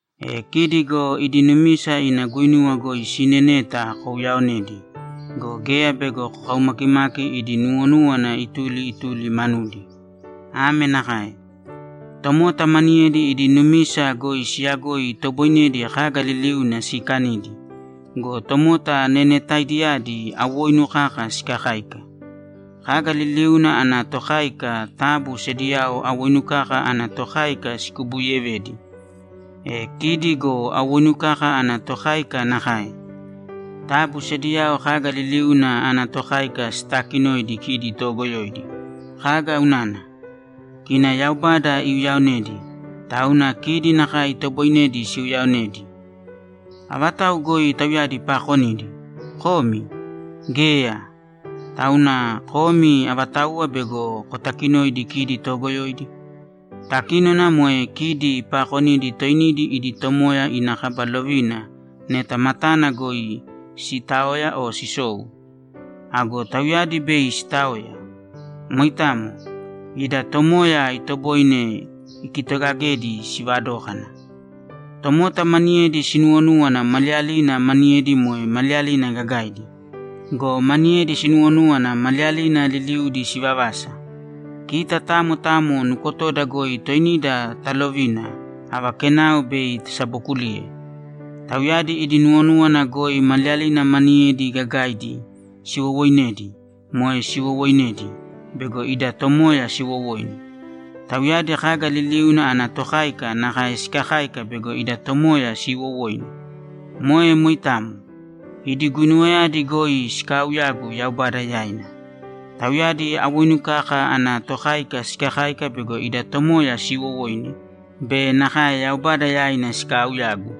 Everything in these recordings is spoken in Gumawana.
E kidi go idi numisa ina guinuwa goi siineneta kouyaonēdi go, geya bego kokaumakimaki idi nuwonúwana ituli ituli manudi. Ame nakae: Tomota maniyedi idi numisa goi siyagoi itoboinedi kaga liliuna siikanidi go, tomota nenetaidiyadi awoinu kaka sikakáika. Kaga liliuna ana tokáika taabu sediyao awoinu kaka ana tokáika sikubuuyevēdi. E kidi go awoinu kaka ana tokáika nakae. Taabu sediyao kaga liliuna ana tokáika sitaakinōidi kidi toogoyoidi. Kaga unana? Kina Yaubada iuyaonedi, tauna kidi nakae itoboinedi siuyaonedi. Avatau goi tauyadi paakonidi? Komi? Geya! Tauna komi avatauwa bego kotakinoidi kidi toogoyoidi? Takínona moe kidi paakonidi toinidi idi Tomoya ina kaba lovina neta matana goi sitaoya o sisou. Ago tauyadi bei sitaoya. Moitamo. Ida Tomoya itoboine ikitogagedi sivadókana. Tomota maniyedi sinuwonúwana maliyalina maniyedi moe maliyalina gagaidi go, maniyedi sinuwonúwana maliyalina liliudi sivavasa. Kita tamo tamo nukotoda goi toinida talovīna ava kenao bei tasabokuliye. Tauyadi idi nuwonúwana goi maliyalina maniyedi gagaidi siwowooinedi moe siwowoinedi bego ida Tomoya siwowoine. Tauyadi kaga liliuna ana tokáika nakae sikakáika bego ida Tomoya siiwowoine. Moe moitamo. Idi guinuwayadi goi sikaauyagu Yaubada yaina. Tauyadi awoinu kaka ana tokáika sikakáika bego ida Tomoya siiwowoine be nakae Yaubada yaina sikaauyagu.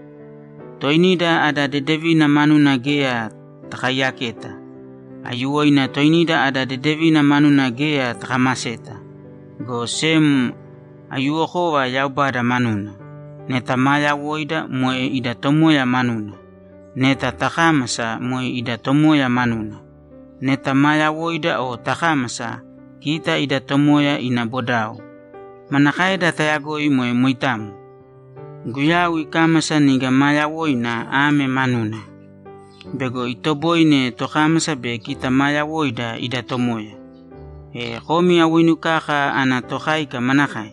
Toinida ada dedevina manuna geya takaiyaketa. Aiyuwoina toinida ada dedevina manuna geya takamaseta, go sem aiyuwokova Yaubada manuna. Neta maa yawoida, moe ida Tomoya manuna. Neta takámasa, moe ida Tomoya manuna. Neta maa yawoida o takámasa, kita ida Tomoya ina bodao. Manakaeda tayagoi moe moitamo? Guyau ikámasa niga maa yawoina ame manuna: Bego itoboine tokámasa be kita maa yawoida ida Tomoya. E komi awoinu kaka ana tokáika manakae?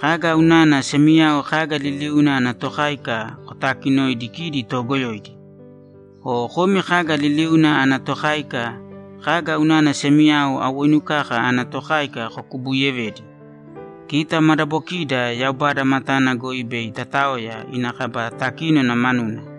Kaga unana semiyao kaga liliuna ana tokáika kotaakinoidi kidi toogoyoidi? O komi kaga liliuna ana tokáika, kaga unana semiyao awoinu kaka ana tokáika kokubuuyevedi? Kita madabokida Yaubada matana goi bei tataoya ina kaba takínona manuna.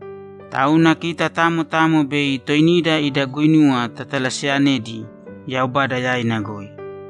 Tauna kita tamo tamo bei toinida ida guinuwa tatalaseyanedi Yaubada yaina goi.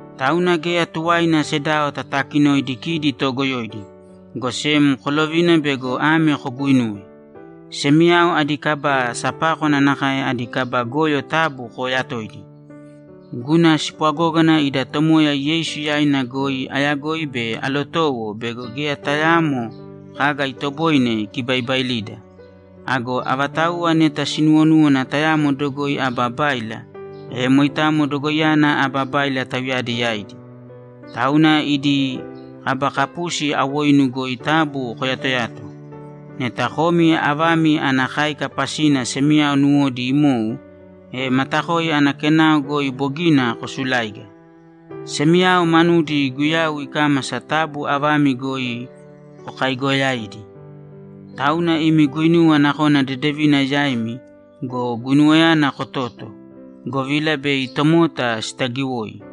Tauna geya tuwaina sedao tatakinoidi kidi toogoyoidi, go sem kolovīna bego ame koguinuwe: Semiyao adi kaba sapákwana nakae adi kaba goyo taabu kooyatōidi. Guna spwagógana ida Tomoya Yeisu yaina goi ayagoi be alotowo bego geya tayaamo kaga itoboine ikibaibailida. Ago avatauwa neta sinuwonúwana tayamo dogoi aba báila, e moitamo dogoiyana aba báila tauyadi yaidi. Tauna idi kaba kapusi awoinu goi taabu koyatoyāto. Neta komi avami ana káika pasina semiyao nuwodi imou, e matakoi ana kenao goi bogina kosuláiga. Semiyao manudi Guyau ikámasa taabu avami goi kokaaigoyāidi. Tauna imi guinuwa nakona dedevina yaimi go, guinuwayana kotōto, govila bei tomota sitagiwoi.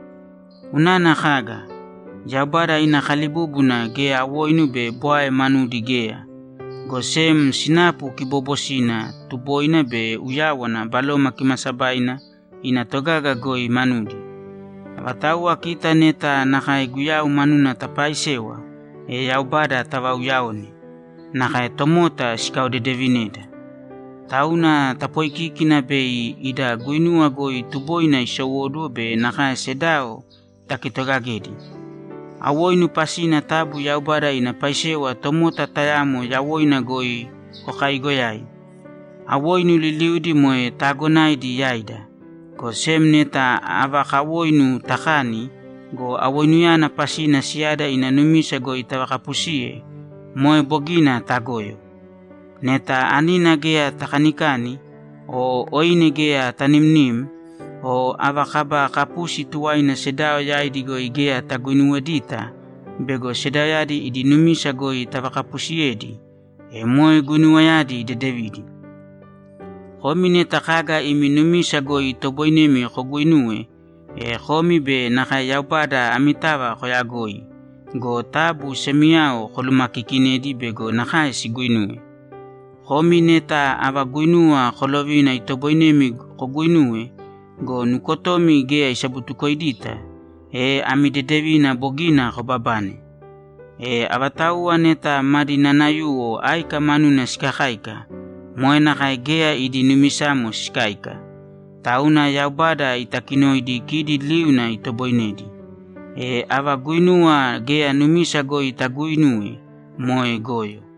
Unana kaga? Yaubada ina kalibúbuna geya awoinu be bwae manudi geya, go sem sinapu kiboobosina, tuboina be uyáwana Baloma Kimaasabaina ina togaga goi manudi. Avatauwa kita neta nakae Guyau manuna tapaaisewa, e Yaubada tavauyaone, nakae tomota sikaodedevineda. Tauna tapoikīkina bei ida guinuwa goi tuboina isowóduwo be nakae sedao takitogagedi. Awoinu pasina taabu Yaubada ina paisewa tomota tayamo yawoina goi kokaaigoyāi. Awoinu liliudi moe taagonaidi yaida, go sem neta ava kawoinu takani go, awoinuyana pasina siyada ina numisa goi tavakapusiye, moe bogina tagoyo. Neta anina geya takanikani o oine geya tanimnim o ava kaba kapusi tuwaina sedao yaidi goi geya taguinuwedita bego sedaoyadi idi numisa goi tavakapusiyedi, e moe guinuwayadi dedevidi. Komi neta kaga imi numisa goi itoboinemi koguinuwe, e komi be nakae Yaubada amitava koyagoi go, taabu semiyao kolumakiikinēdi bego nakae siguinuwe. Komi neta ava guinuwa kolovina itoboinemi koguinuwe go, nukotomi geya isabutukoidita, e ami dedevina bogina kobabane. E avatauwa neta madi nanayuwo áika manuna sikakáika, moe nakae geya idi numisamo sikáika. Tauna Yaubada itakinoidi kidi liuna itoboinedi. E ava guinuwa geya numisa goi taguuinuwe, moe goyo.